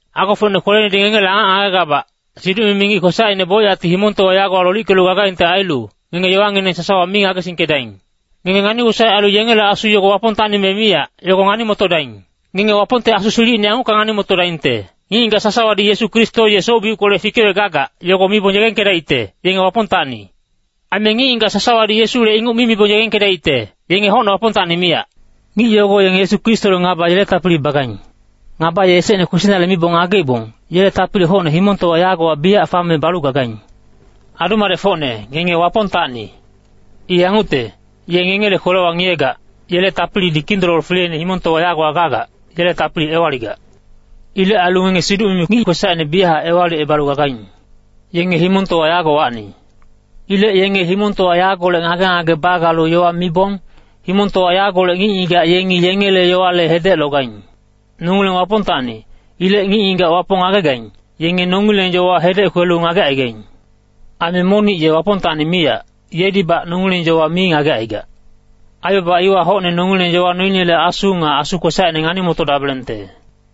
Agofocne kwelenedi ngengele angac ngagegabac, siduc-mimi ngic kwesacine bocyacti himongtowa yagowa lolickelu gagaingte ailu, ngenge yowangineng sasawa mi ngagesingkedaing. Ngenge ngani-wosaec ailu yengele asu yogo Wapongtacni me miyac, yogo ngani-motodaing. Ngenge Wapongte Asu silicine yangucka ngani-motodaingte, ngic-ngigac sasawadi Yesu Kristo ye ngic soc-biuckolec fikewec gagac, yogo mibong yegengkedaicte, yenge Wapongtacni. Aime ngic-ngigac sasawadi Yesule inguc mi mibong yegengkedaicte, yenge hocne Wapongtacni miyac. Ngic yogo yengi Yesu Kristole ngaba yele tapili bagaing. Ngaba ye esecne kwesinale mibong ngageibong, yele tapili hocne himongtowa yagowa biyac fame balu gagaing. Adu-madecfocne, ngenge Wapongtacni. I yangucte, ye ngengele kwelewa ngiyegac, yele tapilidi Kindololo fileine himongtowa yagowa gagac, yele tapili ewaligac. Ilec ailu ngenge siduc-mimi ngic kwesacine biyachac ewalicebalu gagaing. Yenge himongtowa yagowacni. Ilec yenge himongtowa yagolec ngage-ngage bagalu yowa mibong, himongtowa yagolec ngic-ngigac yengi yengele yowale hedec logaing. Nongileng Wapongtacni. Ilec ngic-ngigac Wapong ngagegaing, yenge nongileng yowa hedec kwelu ngagecaigaing. Aime monic ye Wapongtacni miyac, yedibac nongileng yowa mi ngagecaigac. Aibaba iwa hocne nongileng yowa noinele Asu nga asu kwesacine ngani-motodabelengte.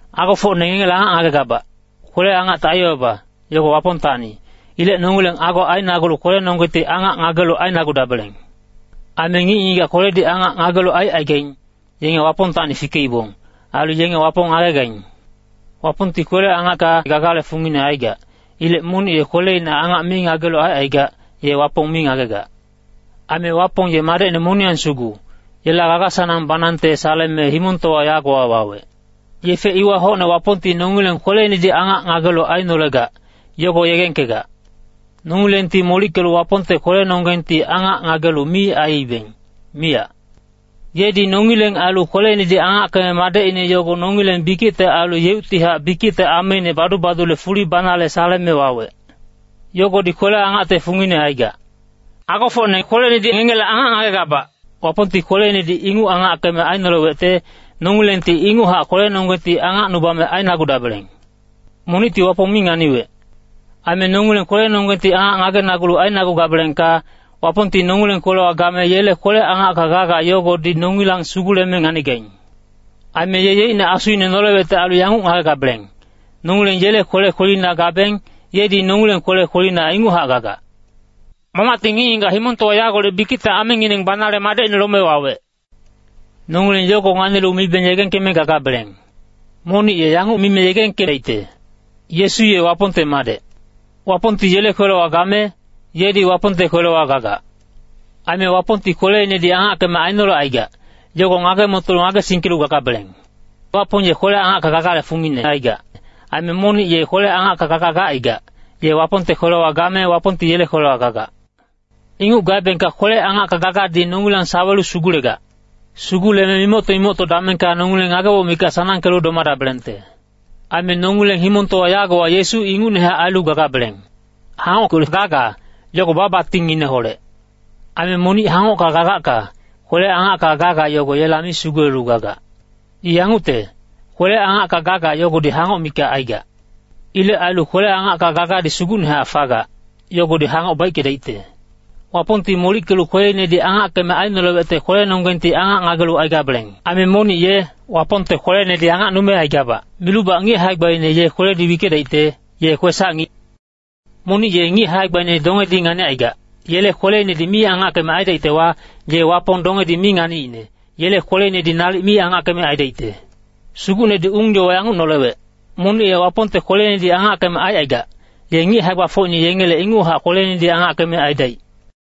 Agofocne ngengele angac ngagegabac, kwele-angacte aibaba, yogo Wapongtacni. Ilec nongileng ago ainagulu kwelenonggengti angac ngagelu ainagudabeleng. Aime ngic-ngigac kweledi angac ngagelu aicaigaing, yenge Wapongtacni fikeibong. Ailu yenge Wapong ngagegaing. Wapongti kwele-angacka gagale fungine aigac. Ilec monic ye kweleina angac mi ngagelu aicaigac, ye Wapong mi ngagegac. Aime Wapong ye Madecine moniyang sugu, yela gaga-sanang banangte saleme himongtowa yagowa wawec. Yefe iwa hocne Wapongti nongileng kweleinedi angac ngagelu ainolegac, yogo yegengkegac. Nongilengti molickelu Wapongte kwelenonggengti angac ngagelu mi aiibeng, miyac. Yedi nongileng ailu kweleinedi angackeme Madecine yogo nongileng bikicte ailu yeuctihac bikicte ameine badu-badule fuli banale saleme wawec. Yogodi kwele-angacte fungine aigac. Agofocne kwelenedi ngengele angac ngagegabac, Wapongti kweleinedi inguc angackeme ainolewecte, nongilengti inguchac kwelenonggengti angacnubame ainagudabeleng. Monicti Wapong mi nganiwec. Aime nongileng kwelenonggengti angac ngagenagulu ainagugabelengka, Wapongti nongileng kwelewa game yele kwele-angacka gaga yogodi nongilang suguleme nganigaing. Aime ye yeicne Asuine nolewecte ailu yanguc ngagegabeleng, nongileng yele kwele kwelina gabeng, yedi nongileng kwele kwelina inguchac gagac. Mamacti ngic-ngigac himongtowa yagolec bikicte amengineng banale Madecine lome wawec. Nongileng yogo nganilu mibeng yegengkeme gagabeleng. Monic ye yanguc mime yegengkedaicte, “Yesu ye Wapongte Madec,” Wapongti yele kwelewa game, yedi Wapongte kwelewa gagac. Aime Wapongti kweleinedi angackeme ainolecaigac, yogo ngage-motolu ngagesingkelu gagabeleng. Wapong ye kwele-angacka gagale fungine aigac. Aime monic ye kwele-angacka gaga gacaigac, ye Wapongte kwelewa game Wapongti yele kwelewa gagac. Inguc gaebengka kwele-angacka gagadi nongilang sawelu sugulegac. Suguleme mimocto-mimocto damengka nongileng ngageboc mikac sanangkelu domadabelengte. Aime nongileng himongtowa yagowa Yesu ingucnehac ailu gagabeleng. Hangockolec gaga, yogo ba-batingngineholec. Aime monic hangocka gagacka, kwele-angacka gaga yogo yela mi sugulelu gagac. I yangucte, kwele-angacka gaga yogodi hangoc mikac aigac. Ilec ailu kwele-angacka gagadi sugucnehac fagac, yogodi hangoc baickedaicte. Wapongti molickelu kweleinedi angackeme ainolewecte kwelenonggengti angac ngagelu aigabeleng. Aime monic ye “Wapongte kwelenedi angacnume aigabac” milubac ngic hae-gbaine ye kweledi wickedaicte, ye kwesac-ngic. Monic ye ngic hae-gbaine dongedi nganicaigac, yele kweleinedi mi angackeme aidaictewa, ye Wapong dongedi mi nganiicne, yele kweleinedi nalic mi angackeme aidaicte. Sugucnedi ung-yowa yanguc nolewec, monic ye Wapongte kweleinedi angackeme aicaigac, ye ngic hae-gbafocine yengele inguchac kweleinedi angackeme aidaic.